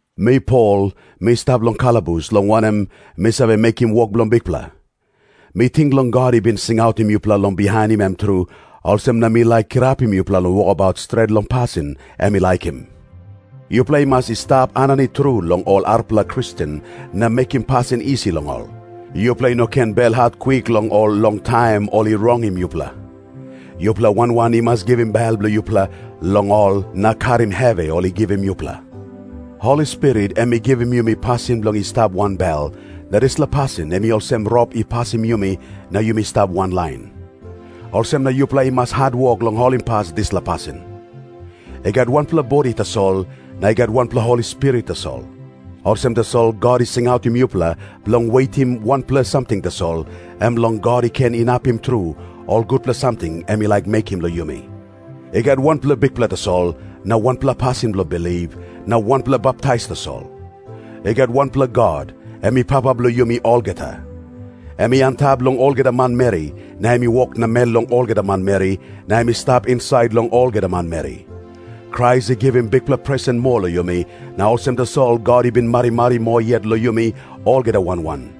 Mi Pol, mi stap long kalabus, long wanem, mi save mekim wok bilong Bikpela. Mi ting long God i bin singautim yupela long bihainim em tru, olsem na mi laik kirapim yupela long wokabaut stret long pasin em i laikim. Yupela i mas i stap aninit tru long ol arapela Kristen na mekim pasin isi long ol. Yupela i no ken belhat kwik long ol long taim ol i rongim yupela. Yupela wan wan i mas givim bel bilong yupela long ol na karim hevi ol i givim yupela. Holi Spirit em i givim yumi pasin bilong i stap wanbel, na dispela pasin em i olsem rop i pasim yumi na yumi stap wanlain. Olsem na yupela i mas hatwok long holimpas dispela pasin. I gat wanpela bodi tasol, na i gat wanpela Holi Spirit tasol. Olsem tasol God i singautim yupela bilong wetim wanpela samting tasol, em long God i ken inapim tru ol gutpela samting em i laik mekim long yumi. I gat wanpela Bikpela tasol, na wanpela pasin bilong bilip, na wanpela baptais tasol. I gat wanpela God, em i Papa bilong yumi olgeta. Em i antap long olgeta manmeri, na em i wok namel long olgeta manmeri, na em i stap insait long olgeta manmeri. Krais i givim bikpela presen moa long yumi, na olsem tasol God i bin marimari moa yet long yumi olgeta wan wan.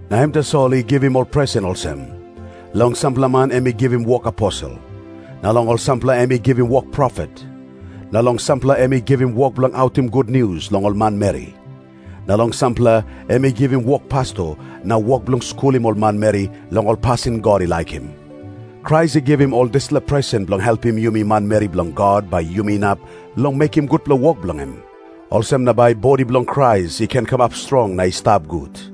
Na em tasol i givim ol presen olsem. Long sampela man em i givim wok aposel. Na long sampela em i givim wok profet. Na long sampela em i givim wok bilong autim gutnius long ol manmeri. Na long sampela em i givim wok pasto na wok bilong skulim ol manmeri long ol pasin God i laikim. Krais i givim ol dispela presen bilong helpim yumi manmeri bilong God bai yumi inap long mekim gutpela wok bilong em. Olsem na bai bodi bilong Krais i ken kamap strong na i stap gut.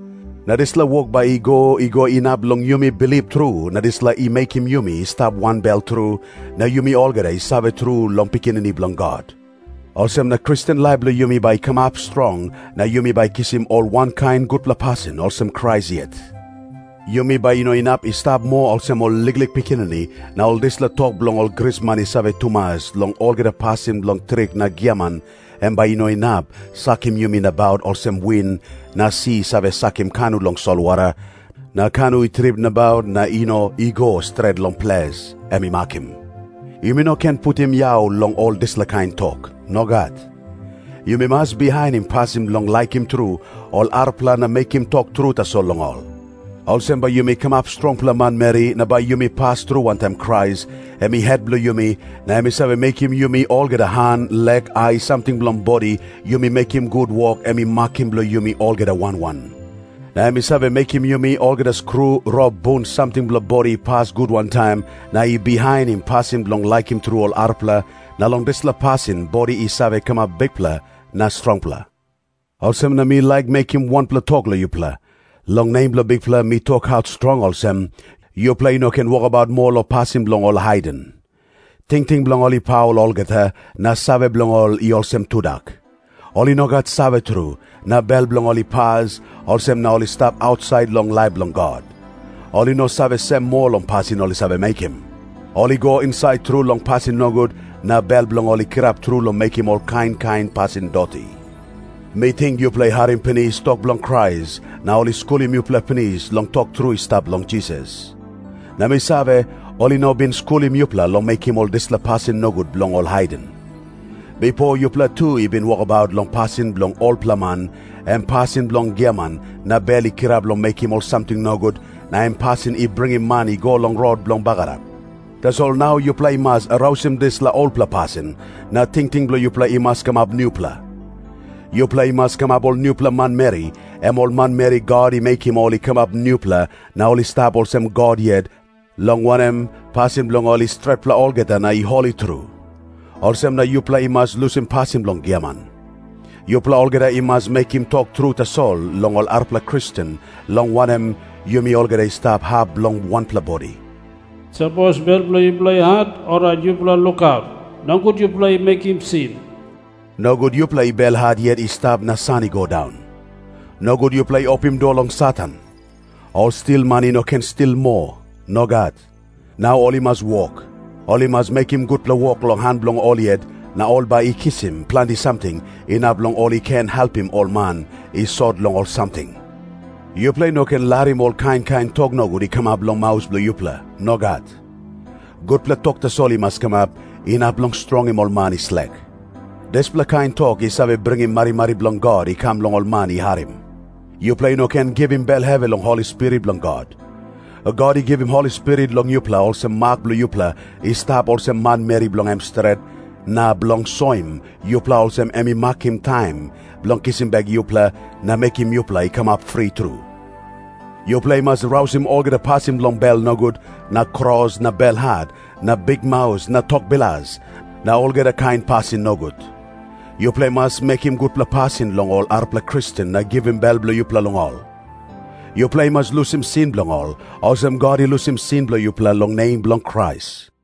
Na dispela wok bai i go i go inap long yumi bilip tru na dispela i mekim yumi i stap wanbel tru, na yumi olgeta i save tru long Pikinini Bilong God. Olsem na Kristen laip bilong yumi bai i kamap strong na yumi bai kisim ol wankain gutpela pasin olsem Krasi yet. Yumi bai i no inap i stap moa olsem ol liklik pikinini, na ol dispela tok bilong ol grisman i save tumas long olgeta pasin bilong trik na giaman, em bai i no inap sakim yumi nabaut olsem win na si i save sakim kanu long solwara, na kanu i trip nabaut na i no i go stret long ples em i makim. Yumi no ken putim yau long ol dispela kain tok. Nogat. Yumi mas bihainim pasin bilong laikim tru ol arapela na mekim tok tru tasol long ol. Olsem bai yumi kamap strongpela manmeri na bai yumi pas tru wantaim Krais, em i het bilong yumi, na em i save mekim yumi olgeta han lek ai samting bilong bodi yumi mekim gut wok em i makim bilong yumi olgeta wan wan. Na em i save mekim yumi olgeta skru rop bun samting bilong bodi i pas gut wantaim na i bihainim pasin bilong laikim tru ol arapela, na long dispela pasin bodi i save kamap bikpela na strongpela. Olsem na mi laik mekim wanpela tok long yupela. Long nem bilong Bikpela mi tokaut strong olsem, yupela i no ken wokabaut moa long pasin bilong ol haiden. Tingting bilong ol i paul olgeta, na save bilong ol i olsem tudak. Ol i no gat save tru, na bel bilong ol i pas, olsem na ol i stap ausait long laip bilong God. Ol i no save sem moa long pasin ol i save mekim. Ol i go insait tru long pasin nogut, na bel bilong ol i kirap tru long mekim ol kain kain pasin doti. Mi ting yupela i harim pinis tok bilong Krais, na ol i skulim yupela pinis long tok tru i stap long Jisas. Na mi save, ol i no bin skulim yupela long mekim ol dispela pasin nogut bilong ol haiden. Bipo yupela tu i bin wokabaut long pasin bilong olpela man, em pasin bilong giaman na bel i kirap long mekim ol samting nogut, na em pasin i bringim man i go long rot bilong bagarap. Tasol nau yupela i mas rausim dispela olpela pasin na tingting bilong yupela i mas kamap nupela. Yupela i mas kamap ol nupela manmeri, em ol manmeri God i mekim ol i kamap nupela na ol i stap olsem God yet, long wanem, pasin bilong ol i stretpela olgeta na i holi tru. Olsem na yupela i mas lusim pasin bilong giaman. Yupela olgeta i mas mekim tok tru tasol long ol arapela Kristen, long wanem, yumi olgeta i stap hap bilong wanpela bodi. Sapos bel bilong yupela i hat, orait yupela lukaut. Nogut yupela i mekim sin. Nogut yupela i belhat yet i stap na san i go daun. Nogut yupela i opim dua long Satan. Ol stilman i no ken stil moa. Nogat. Nau ol i mas wok. Ol i mas mekim gutpela wok long han bilong ol yet, na ol bai i kisim planti samting, inap long ol i ken helpim ol man i sot long ol samting. Yupela i no ken larim ol kain kain tok nogut i kamap long maus bilong yupela. Nogat. Gutpela tok tasol i mas kamap, inap long strongim ol man i slek. Dispela kain tok i save bringim marimari bilong God i kam long ol man i harim. Yupela i no ken givim bel hevi long Holi Spirit bilong God. God i givim Holi Spirit long yupela olsem mak bilong yupela i stap ol manmeri bilong em stret, na bilong soim yupela olsem em i makim taim bilong kisim bek yupela na mekim yupela i kamap fri tru. Yupela i mas rausim olgeta pasin bilong bel nogut na kros na belhat na bikmaus na tok bilas, na olgeta kain pasin nogut. Yupela i mas mekim gutpela pasin long ol arapela Kristen na givim bel bilong yupela long ol. Yupela i mas lusim sin bilong ol, olsem God i lusim sin bilong yupela long nem bilong Krais.